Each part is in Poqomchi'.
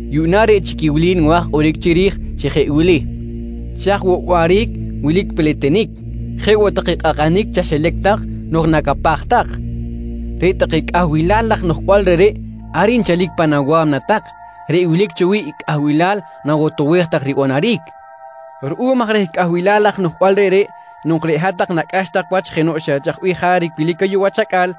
Yuꞌna reꞌ chic i wili nwa̱j kꞌoric chiri̱j chi jeꞌ wili: Chaj woꞌ waꞌric wilic peletenic, jeꞌ woꞌ take kꞌakꞌanic chaxilac tak nok nacapaj tak? Reꞌ take cꞌahbilal laj noꞌjbal reꞌreꞌ ar nchalic pan awa̱mna tak reꞌ wilic cho wi̱ꞌ i cꞌahbilal nawotowej tak ribanaric. Ruꞌum aj reh cꞌahbilal laj noꞌjbal reꞌreꞌ nok reꞌ hat-tak nacꞌax tak wach jenoꞌ xa chaj bih jaric wilic ayuꞌ wach acꞌal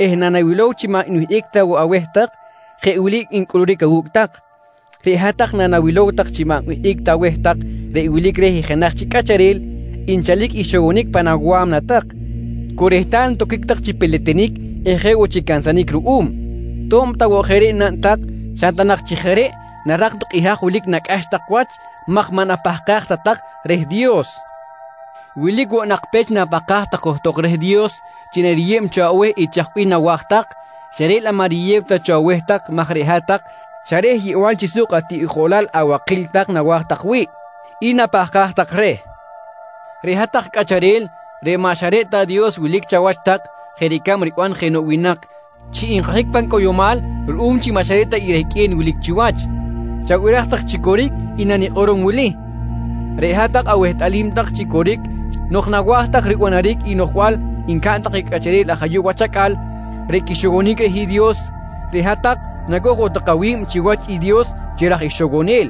eh nanawilow chi maꞌ nwihꞌic ta woꞌ aweh tak, jeꞌ wili ncꞌuluric awu̱cꞌ tak: Reꞌ hat-tak nanawilow tak chi maꞌ nwihꞌic ta aweh tak reꞌ wilic reh i jenaj chic cꞌacharel, nchalic ixowonic pan awa̱mna tak, cu rehtal toquic tak chi peletenic eh jeꞌ woꞌ chi cansanic ruꞌum. To̱b ta woꞌ jeꞌ reꞌ naꞌn tak xa ta nak chi jeꞌ reꞌ narak tak i haj wilic nacꞌax tak wach maj maꞌ napahkaj ta tak reh Dios. Wilic woꞌ nak pech napahkaj tak johtok reh Dios chi nariyeb cho aweh i chaj bih nawa̱j tak, xa reꞌ laꞌ maꞌ riyew ta cho aweh tak maj reꞌ hat-tak xa reh yeꞌbal chi suk atiꞌjolal abakil tak nawa̱j tak wi̱ꞌ i napahkaj tak reh. Reꞌ hat-tak cꞌacharel reꞌ maꞌ xa reꞌ ta Dios wilic chawach tak jeꞌ ricab riban jenoꞌ winak chi nkajic pan cꞌoyomal ruꞌum chi maꞌ xa reꞌ ta i rehqꞌue̱n wilic chiwach, chabiraj tak chi coric i nanikꞌorom wili: Reꞌ hat-tak awehtꞌalim tak chi coric chi nok nawa̱j tak ribanaric i noꞌjbal ncaꞌn take cꞌacharel aj ayuꞌ wach acꞌal reꞌ quixowonic reh i Dios, reꞌ hat-tak nacoj woꞌ tak awi̱b chiwach i Dios chi raj ixowonel.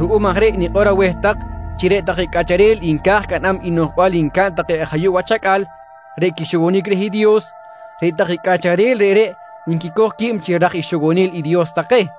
Ruꞌum aj reꞌ nikꞌor aweh tak chi reꞌ take cꞌacharel nca̱j caꞌnam i noꞌjbal ncaꞌn take aj ayuꞌ wach acꞌal reꞌ quixowonic reh i Dios, reꞌ take cꞌacharel reꞌreꞌ nquicoj qui̱b chi raj ixowonel i Dios take.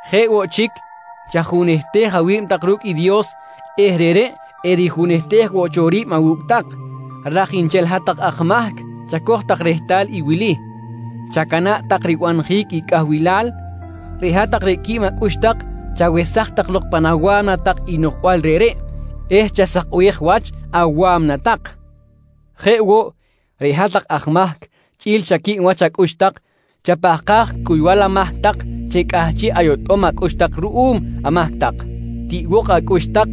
Jeꞌ woꞌ chic, chajunehtej awi̱b tak ru̱cꞌ i Dios eh reꞌreꞌ erijunehtej woꞌ cho ri̱b awu̱cꞌ tak. Raj nchel hat-tak aj mahc, chacoj tak rehtal i wili: Chacana̱ꞌ tak ribanjic i cꞌahbilal. Reꞌ hat-tak reꞌ quib acꞌux tak, chawesaj tak lok pan awa̱mna tak i noꞌjbal reꞌreꞌ eh chasakbej wach awa̱mna tak. Jeꞌ woꞌ, reꞌ hat-tak aj mahc chꞌi̱l xa quib wach acꞌux tak, chapahkaj cuybal amahc tak chi cꞌahchiꞌ ayotꞌom acꞌux tak ruꞌum amahc tak. Tiꞌbok acꞌux tak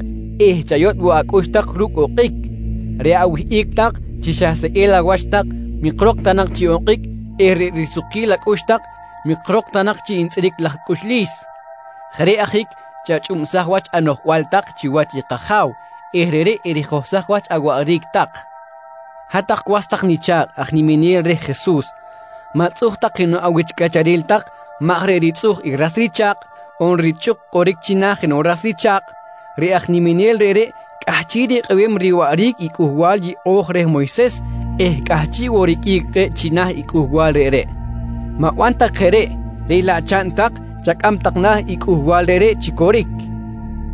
eh chayotꞌ woꞌ acꞌux tak ru̱cꞌ okꞌic. Reꞌ awihꞌic tak chi xa seꞌel awach tak mikrok ta nak chi okꞌic eh reꞌ risukquil acꞌux tak mikrok ta nak chi ntzꞌiric laj cꞌuxlis. Jeꞌ reꞌ ajic chachꞌubsaj wach anoꞌjbal tak chiwach i kAja̱w eh reꞌreꞌ erijohsaj wach awaꞌric tak. Hat-tak was tak nicha̱kꞌ aj niminel reh Jesus, ma̱tzꞌuj tak jenoꞌ awich cꞌacharel tak maj reꞌ ritzꞌuj i ras richa̱kꞌ on richꞌuk kꞌoric china̱ jenoꞌ ras richa̱kꞌ, reꞌ aj niminel reꞌreꞌ cꞌahchiꞌ rikꞌebem riwaꞌric i Cꞌuhbal Yeꞌo̱j reh Moyses eh cꞌahchiꞌ woꞌ riqꞌuic kꞌe̱ꞌ china̱ i cꞌuhbal reꞌreꞌ. Ma̱ban tak jeꞌ reꞌ, reꞌ laꞌ chaꞌn tak chacꞌam tak na̱ i cꞌuhbal reꞌreꞌ chi coric.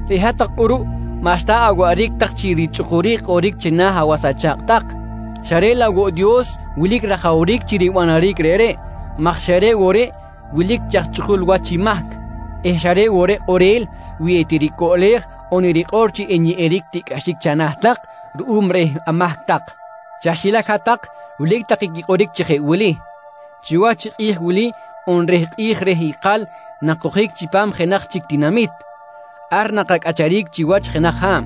Reꞌ hat-tak kꞌuruꞌ maꞌxta awaꞌric tak chi richꞌukuric kꞌoric china̱ awas acha̱kꞌ tak, xa reꞌ laꞌ woꞌ Dios wilic rajawric chi ribanaric reꞌreꞌ maj xa reꞌ woꞌ reꞌ wilic chi aj chꞌukul wach i mahc eh xa reꞌ woꞌ reꞌ kꞌorel wi etiricoꞌlej on erikꞌor chi enyeꞌeric tiꞌcꞌaxic chana̱ tak ruꞌum reh amahc tak. Chaxilac hat-tak wilic take quikꞌoric chi jeꞌ wili: «Chiwach i kꞌi̱j wili on reh kꞌi̱j reh ikal nakojic chipam jenaj chic tinamit. Ar nakacꞌacharic chiwach jenaj ha̱b.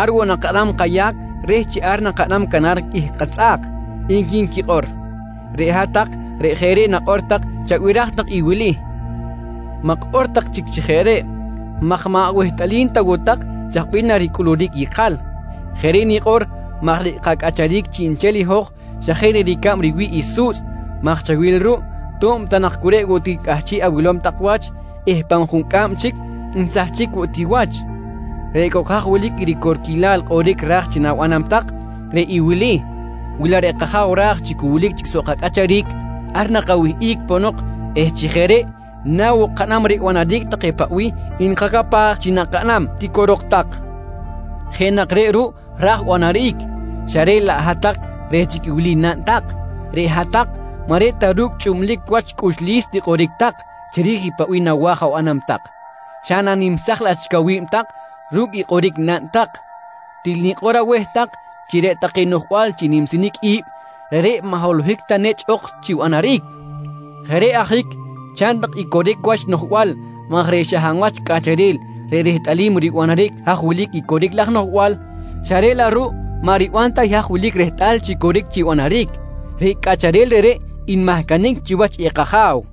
Ar woꞌ nakaꞌnam kayac reh chi ar nakaꞌnam canar qꞌuih katzꞌa̱k, nqui nquikꞌor. Reꞌ hat-tak reꞌ jeꞌ reꞌ nakꞌor tak chabiraj tak i wili: Ma̱kꞌor tak chic chi jeꞌ reꞌ maj maꞌ awehtꞌalim ta woꞌ tak chaj bih naricꞌuluric ikal. Jeꞌ reꞌ nikꞌor maj reꞌ kacꞌacharic chiꞌnchel i hoj xa jeꞌ na ricab riwi̱ꞌ i su̱tzꞌ maj chawil ruꞌ, to̱b ta nak cu reꞌ woꞌ ti cꞌahchiꞌ awilom tak wach eh pa̱m juncꞌam chic nsahchic woꞌ ti wach. Reꞌ cok haj wilic i ricorquilal kꞌoric raj chi na̱banam tak, reꞌ i wili: «Wi laꞌ reꞌ kAja̱w ra̱j chi cu wilic chic soꞌ kacꞌacharic, ar nakawihꞌic ponok eh chi jeꞌ reꞌ na woꞌ kaꞌnam ribanaric take paꞌ bih nkacapaj chi nakaꞌnam, tiquirok tak. Jeꞌ nak reꞌ ruꞌ ra̱j banaric xa reꞌ laꞌ hat-tak reꞌ chic i wili naꞌn tak: Reꞌ hat-tak maꞌ reꞌ ta ru̱cꞌ chꞌublic wach cꞌuxlis tikꞌoric tak chiri̱j i paꞌ bih nawa̱j abanam tak, xa nanimsaj laꞌ chic awi̱b tak ru̱cꞌ i kꞌoric naꞌn tak. Til nikꞌor aweh tak chi reꞌ take noꞌjbal chi nimsinic i̱b, reꞌreꞌ maꞌ holohic ta nechꞌ ok chi banaric. Jeꞌ reꞌ ajic chaꞌn tak i coric wach noꞌjbal maj reꞌ xa hab wach cꞌacharel reꞌ rehtꞌalim ribanaric haj wilic i coric laj noꞌjbal, xa reꞌ laꞌ ruꞌ maꞌ riban ta i haj wilic rehtꞌal chi coric chi banaric, reꞌ cꞌacharel reꞌreꞌ nmahcanic chiwach i kAja̱w.